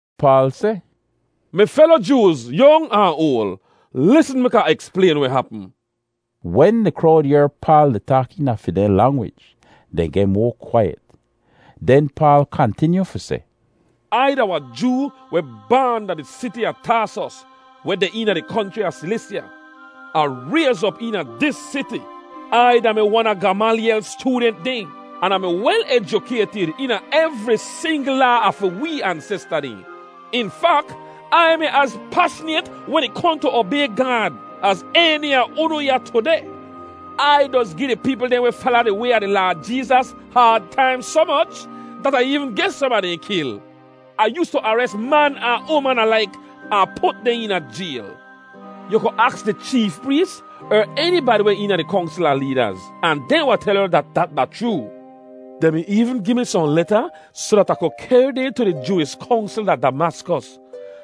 Paal seh, “Mi felo Jooz, yong ahn oal, lisn mek Ah eksplayn weh hapm!” Wen di krowd yehr Paal di taak eena fi dehn langwij, dehn geh moa kwaiyet. Den Paal kantinyu fi seh, “Ai da wahn Joo weh baan da di siti a Taasos, weh deh eena di konchri a Silisya. Ah rayz op eena dis siti. Ai da-mi wan a Gamalyel styoodent dehn, an Ah mi wel ejukaytid eena evri singl laa a fi wee ansesta dehn. In fak, Ai mi az pashnayt wen ih kohn tu obay Gaad az eni a unu ya tudeh. Ai doz gi di peepl dehn weh fala di Way a di Laad Jeezas haad taim soh moch dat Ah eevn geh som a dehn kil. Ah yoostu ares man ahn uman alaik ahn put dehn eena jayl. Yu ku aks di cheef prees er enibadi weh eena di Kongsl a leedaz, ahn dehn wahn tel yu dat dat da chroo. Dehn mi eevn gi mi sohn leta soh dat Ah ku kehr dehn tu di Jooish Kongsl da Damaskos,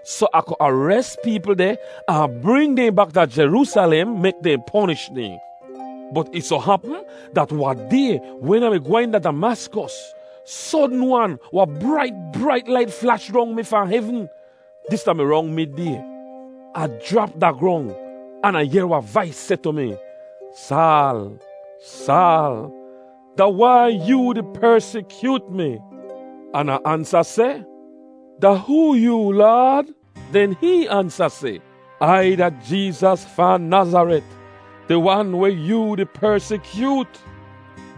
soh Ah ku ares peepl deh ahn bring dehn bak da Jeroosalem mek dehn ponish dehn. “Bot ih soh hapm dat wahn day wen Ah mi gwehn da Damaskos, sodn-wan wahn brait brait lait flash rong mi fahn hevn; dis da-mi rong mid-day. Ah jrap da grong, an Ah yehr wahn vais seh tu mi, ‘Saal, Saal, da wai yoo di persikyoot mi?’ “An Ah ansa seh, ‘Da hoo yoo, Laad?’ “Den hihn ansa seh, ‘Ai da Jeezas fahn Nazaret, di Wan weh yoo di persikyoot.’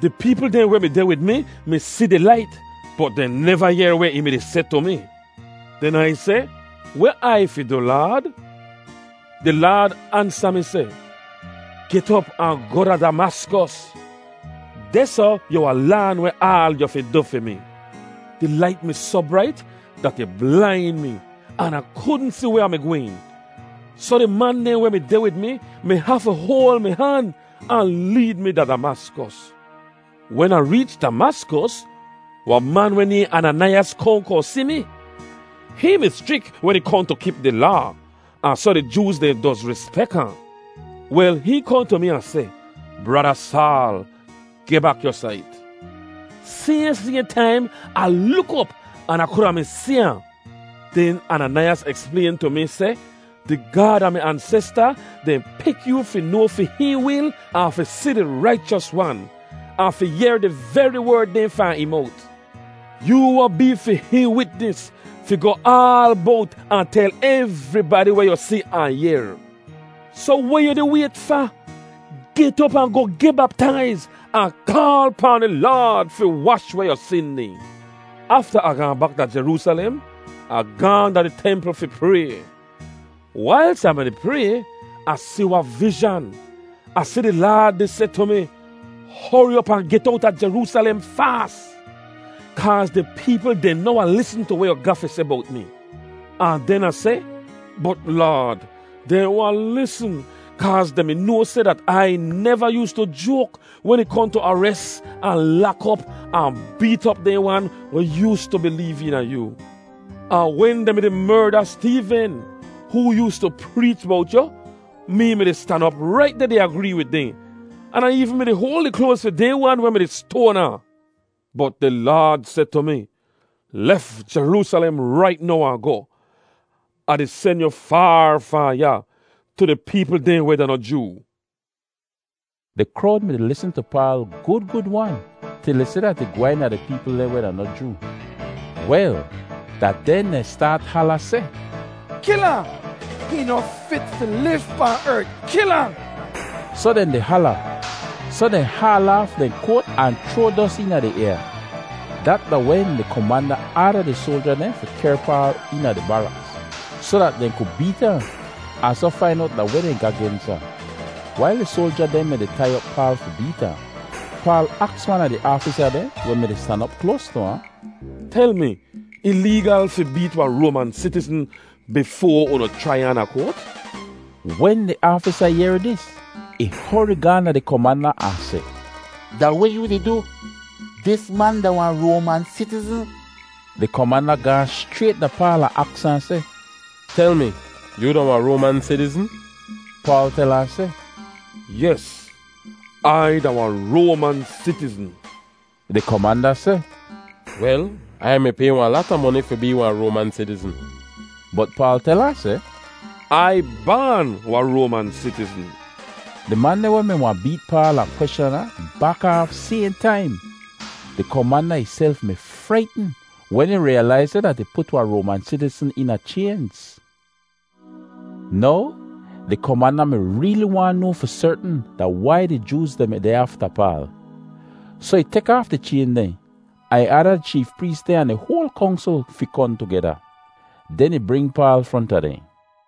Di peepl dehn weh mi deh wid mi mi si di lait bot dehn neva yehr weh ih mi-di seh tu mi. “Den Ai seh, ‘Weh Ai fi du, Laad?’ “Di Laad ansa mi seh, ‘Get op ahn goh da Damaskos. Dehsoh yu wahn laan weh aal yu fi du fi mi.’ Di lait mi soh brait dat ih blain mi an Ah kudn si weh Ah mi gwehn, soh di man dehn weh mi deh wid mi mi hafu hoal mi han ahn leed mi da Damaskos. “Wen Ah reech Damaskos, wahn man weh nayhn Ananaiyas kohn kohn si mi. Hihn mi schrik wen ih kohn tu kip di Laa, ahn soh di Jooz dehn doz rispek ahn. Wel, hihn kohn tu mi ahn seh, ‘Brada Saal, geh bak yu sait.’ Sayhn sayhn taim Ah luk op an Ah kuda mi si ahn. “Den Ananaiyas eksplayn tu mi seh, ‘Di Gaad a mi ansesta dehn pik yoo fi noa fi hihn wil ahn fi si di Raichos Wan, ahn fi yehr di veri werd dehn fahn ih mowt. Yoo wahn bee fi hihn witnis fi goh aal bowt ahn tel evribadi weh yu si ahn yehr. Soh weh yu di wayt fa? Get op ahn goh geh baptaiz ahn kaal pahn di Laad fi wash weh yu sin dehn.’ “Afta Ah gaahn bak da Jeroosalem, Ah gaahn da di templ fi pray. Wailz Ah mi-di pray, Ah si wahn vizhan. Ah si di Laad di seh tu mi, ‘Hori op ahn get owta Jeroosalem faas, kaaz di peepl dehn noh wahn lisn tu weh yu ga fi seh bowt mi.’ “Ahn den Ah seh, ‘Bot Laad, dehn wahn lisn kaaz dehn mi noa seh dat Ai neva yoostu joak wen ih kohn tu ares ahn lak op ahn beet op dehn wan weh yoostu bileev eena yoo. Ahn wen dehn mi-di merda Steeven, hoo yoostu preech bowt yu, mee mi-di stan op rait deh di agree wid dehn, an Ah eevn mi-di hoal di kloaz fi dehn wan weh mi-di stoan ahn.’ “Bot di Laad seh tu mi, ‘Lef Jeroosalem rait now ahn goh. Ah di sen yu faar fahn ya, tu di peepl dehn weh da noh Joo.’” Di krowd mi-di lisn tu Paal gud gud-wan til ih seh dat ih gwehn da di peepl dehn weh da noh Joo. Wel, da den dehn staat hala seh, “Kil ahn! Hihn noh fit fi liv pahn ert. Kil ahn!” Soh dehn di hala, soh dehn di haal aaf dehn koat ahn chroa dos eena di ayaa. Dat da wen di komanda aada di soalja dehn fi kehr Paal eena di baraks soh dat dehn ku beet ahn, ahn soh fain owt da weh dehn ga gens ahn. Wail di soalja dehn mi-di tai op Paal fi beet ahn, Paal aks wan a di aafisa dehn weh mi-di stan op kloas tu ahn, “Tel mi, ih leegal fi beet wahn Roaman sitizn bifoa unu chrai ahn da koat?” Wen di aafisa yehr dis, ih hori gaahn da di komanda ahn seh, “Da weh yoo di du? Dis man da wahn Roaman sitizn.” Di komanda gaahn schrayt da Paal ahn aks ahn seh, “Tel mi, yoo da wahn Roaman sitizn?” Paal tel ahn seh, “Yes, Ai da wahn Roaman sitizn.” Di komanda seh, “Wel, Ai mi pay wahn lata moni fi bee wahn Roaman sitizn.” Bot Paal tel ahn seh, “Ai baan wahn Roaman sitizn.” Di man dehn weh mi wahn beet Paal ahn kweschan ahn bak aaf sayhn taim. Di komanda ihself mi fraitn wen ih riyalaiz seh dat ih put wahn Roaman sitizn eena chaynz. Now di komanda mi reeli waahn noa fi sertn da wai di Jooz dehn mi deh afta Paal. Soh ih tek aaf di chayn dehn ahn ih aada di cheef prees dehn ahn di hoal Kongsl fi kohn tugeda. Den ih bring Paal fronta dehn.